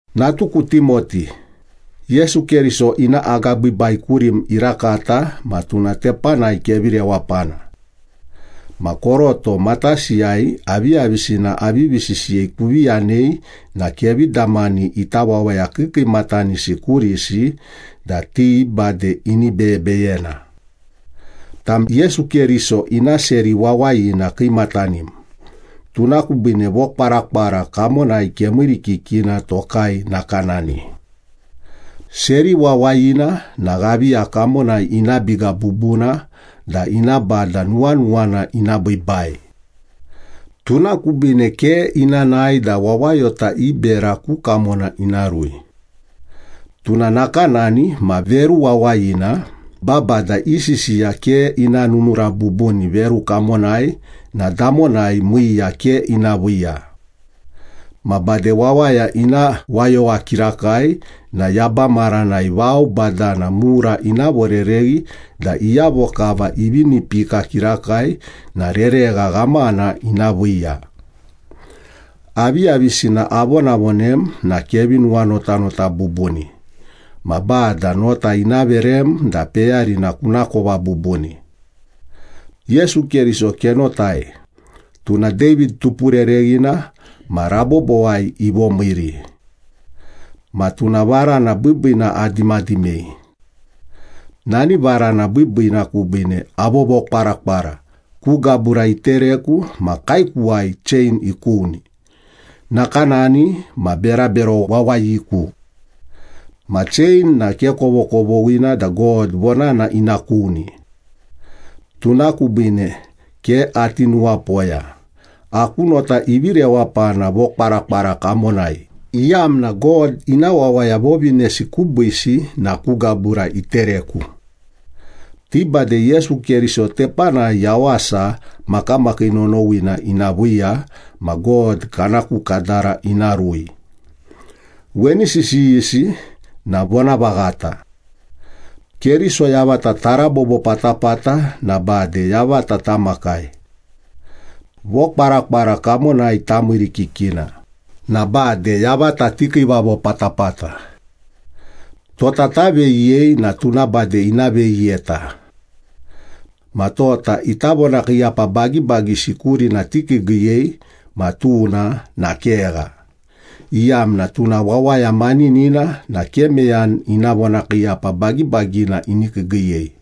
Natuku Timoti, Yesu Keriso ina agabiibai kurim irakata ma tuna tepanai kevi rewapana. Ma koroto matasiyai aviyavisina avivi sisiyei kuvi yanei na kevi damani ita wawaya kiikiimatanisi kurisi da ti bade ini beyebeyena. Tam Yesu Keriso ina seri wawayina kiimatanim, tuna kubiine vokwarakwara kamonai kemiirikikina tokai nakanani. Seri wawayina na ghaviya kamonai ina biga bubuna da ina bada nuwanuwana ina biibai. Tuna kubiine ke ina nae da wawayota i bera ku kamona ina rui. Tuna nakanani ma veru wawayina babada i sisiya ke ina nunura bubuni veru kamonai na damonai miiya ke ina viiya. Ma bade wawaya ina wayowa kirakai na yaba maranai vao badana mura ina vorereghi da iyavo kava ivi inipika kirakai na reregha ghamana ina viiya. Aviyavisina avonavonem na kevi nuwanotanota bubuni, ma Bada nota ina verem da peyarina kunakova bubuni. Yesu Keriso kenotai, tuna David tupurereghina ma rabobowai ivomiiri. Ma tuna varana biibiina adimadimei. Nani varana biibiina kubiine avovokwarakwara, ku gabura itereku ma kaekuwai chein ikuni, nakanani ma berabero wawayiku. Ma chein na ke kovokovoghina da God vonana ina kuni. Tuna kubiine ke ati nuwapoya, aku nota ivi rewapana vokwarakwara kamonai, iyamna God ina wawaya vovinesi kubiisi na ku gabura itereku. Ti bade Yesu Keriso tepanai yawasa makamakii nonowina ina viiya ma God kana ku kadara ina rui. Weni sisiyisi na vonavaghata. “Keriso yavata tarabobo patapata, na bade yavata tamakai. Vokwarakwara kamonai tamiirikikina, na bade yavata tikiivavo patapata. Tota taveyiyei na tuna bade ina veyiyeta. Ma tota ita vonakiiyapa bagibagisi kurina tikiigiiyei, ma tuna na kegha, Iyamna tuna wawaya maninina na ke meyani ina vonakiiyapa bagibagina ini kiigiiyei.”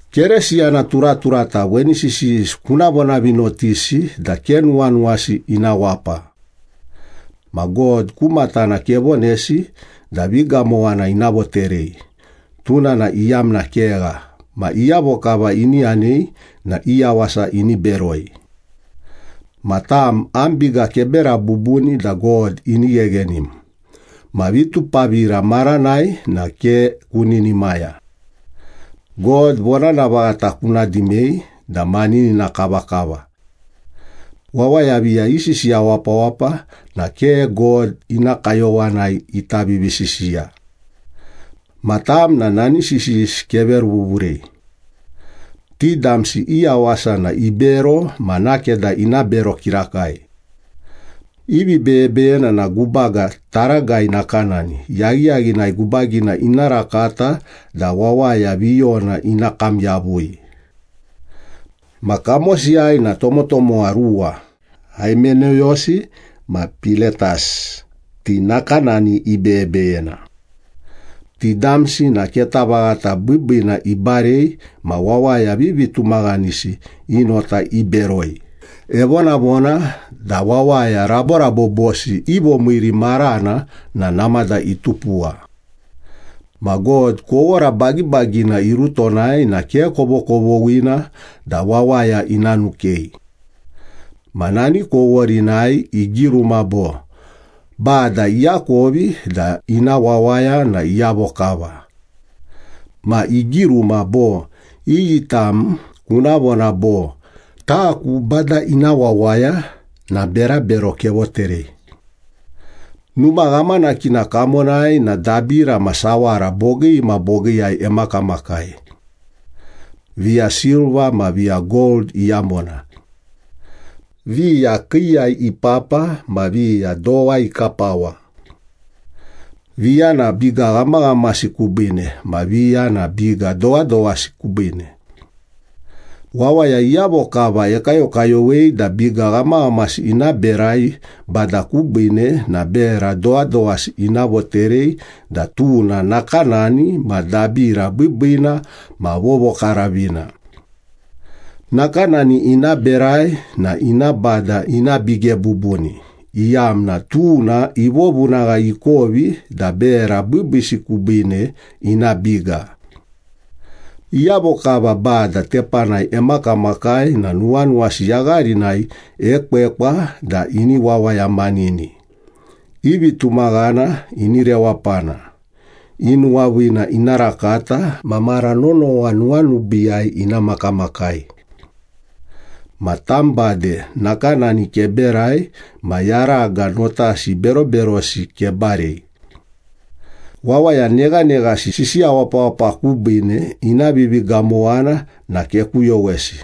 Keresiyana turaturata weni sisiyisi kuna vonavinotisi da ke nuwanuwasi ina wapa. Ma God ku matana kevonesi da vigamowana ina voterei, tuna na iyamna kegha, ma iyavo kava ini yanei na i yawasa ini beroi. Ma tam, am biga kebera bubuni da God ini gheghenim, ma vitupavira maranai na ke kuninimaya. God vonana vaghata kuna dimei da maninina kavakava. Wawaya viya isisiya wapawapa na ke God ina kayowanai ita vivisisiya. Ma tam na nani sisiyisi keveruvuvurei. Ti damsi i yawasa na ibero ma nakeda ina bero kirakai. I vibeyebeyena na gubaga taragai nakanani, yaghiyaghinai gubagina ina rakata da wawaya viyona ina kam yavui. Ma kamosiyai na tomotomowa ruwa, Haimeneyosi ma Piletas, ti nakanani ibeyebeyena. Ti damsi na keta vaghata biibiina ibarei ma wawaya vivitumaghanisi i nota iberoi, evonavona da wawaya raborabobosi i vomiiri marana na namada itupuwa. Ma God kowora bagibagina irutonai na ke kovokovoghina da wawaya ina nukei. Ma nani koworinai igiruma bo, “Bada iakovi da ina wawaya na iyavo kava.” Ma igiruma bo “Iyi tam kuna vona bo, ‘Taku Bada ina wawaya’ na berabero kevoterei.” Numa ghamanakina kamonai na dabira ma sawara bogii ma bogiiyai emakamakai. Viya silva ma viya gold iyamona. Viya kiiyai ipapa ma viya dowa ikapawa. Viya na biga ghamaghamasi kubiine ma viya na biga dowadowasi kubiine. Wawaya iyavo kava ekayokayowei da biga ghamaghamasi ina berai Bada kubiine na bera dowadowasi ina voterei da tuna nakanani ma dabira biibiina ma vovokaravina. Nakanani ina berai na ina Bada ina bige bubuni, iyamna tuna ivovunagha ikovi da bera biibiisi kubiine ina biga. Iyavo kava Bada tepanai emakamakai na nuwanuwasi yagharinai ekwekwa da ini wawayamanini, i vitumaghana ini rewapana, i nuwaviina ina rakata ma mara nonowa nuwanubiiyai ina makamakai. Ma tam bade nakanani keberai ma yaraga notasi beroberosi kebarei. Wawaya neghaneghasi sisiya wapawapa kubiine ina vivigamowana na kekuyowesi.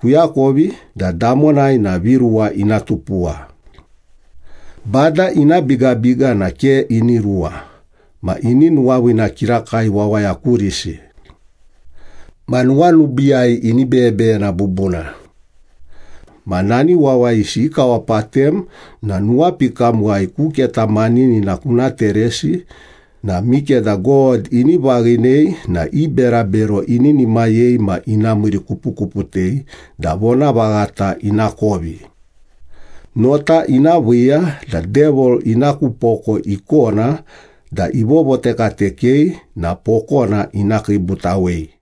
Kuakovi da damonai na viruwa ina tupuwa. Bada ina bigabiga na ke ini ruwa, ma ini nuwaviina kirakai wawaya kurisi. Ma nuwanubiiyai ini beyebeyena bubuna. Ma nani wawayisi ikawapatem na nuwapikamuwai ku keta maninina kuna teresi na mikeda God ini vaghinei na i berabero ininimayei ma ina miirikupukuputei da vonavaghata inakovi. Nota ina viiya da Devil ina ku poko ikona da ivovotekatekei na pokona ina kiibutawei.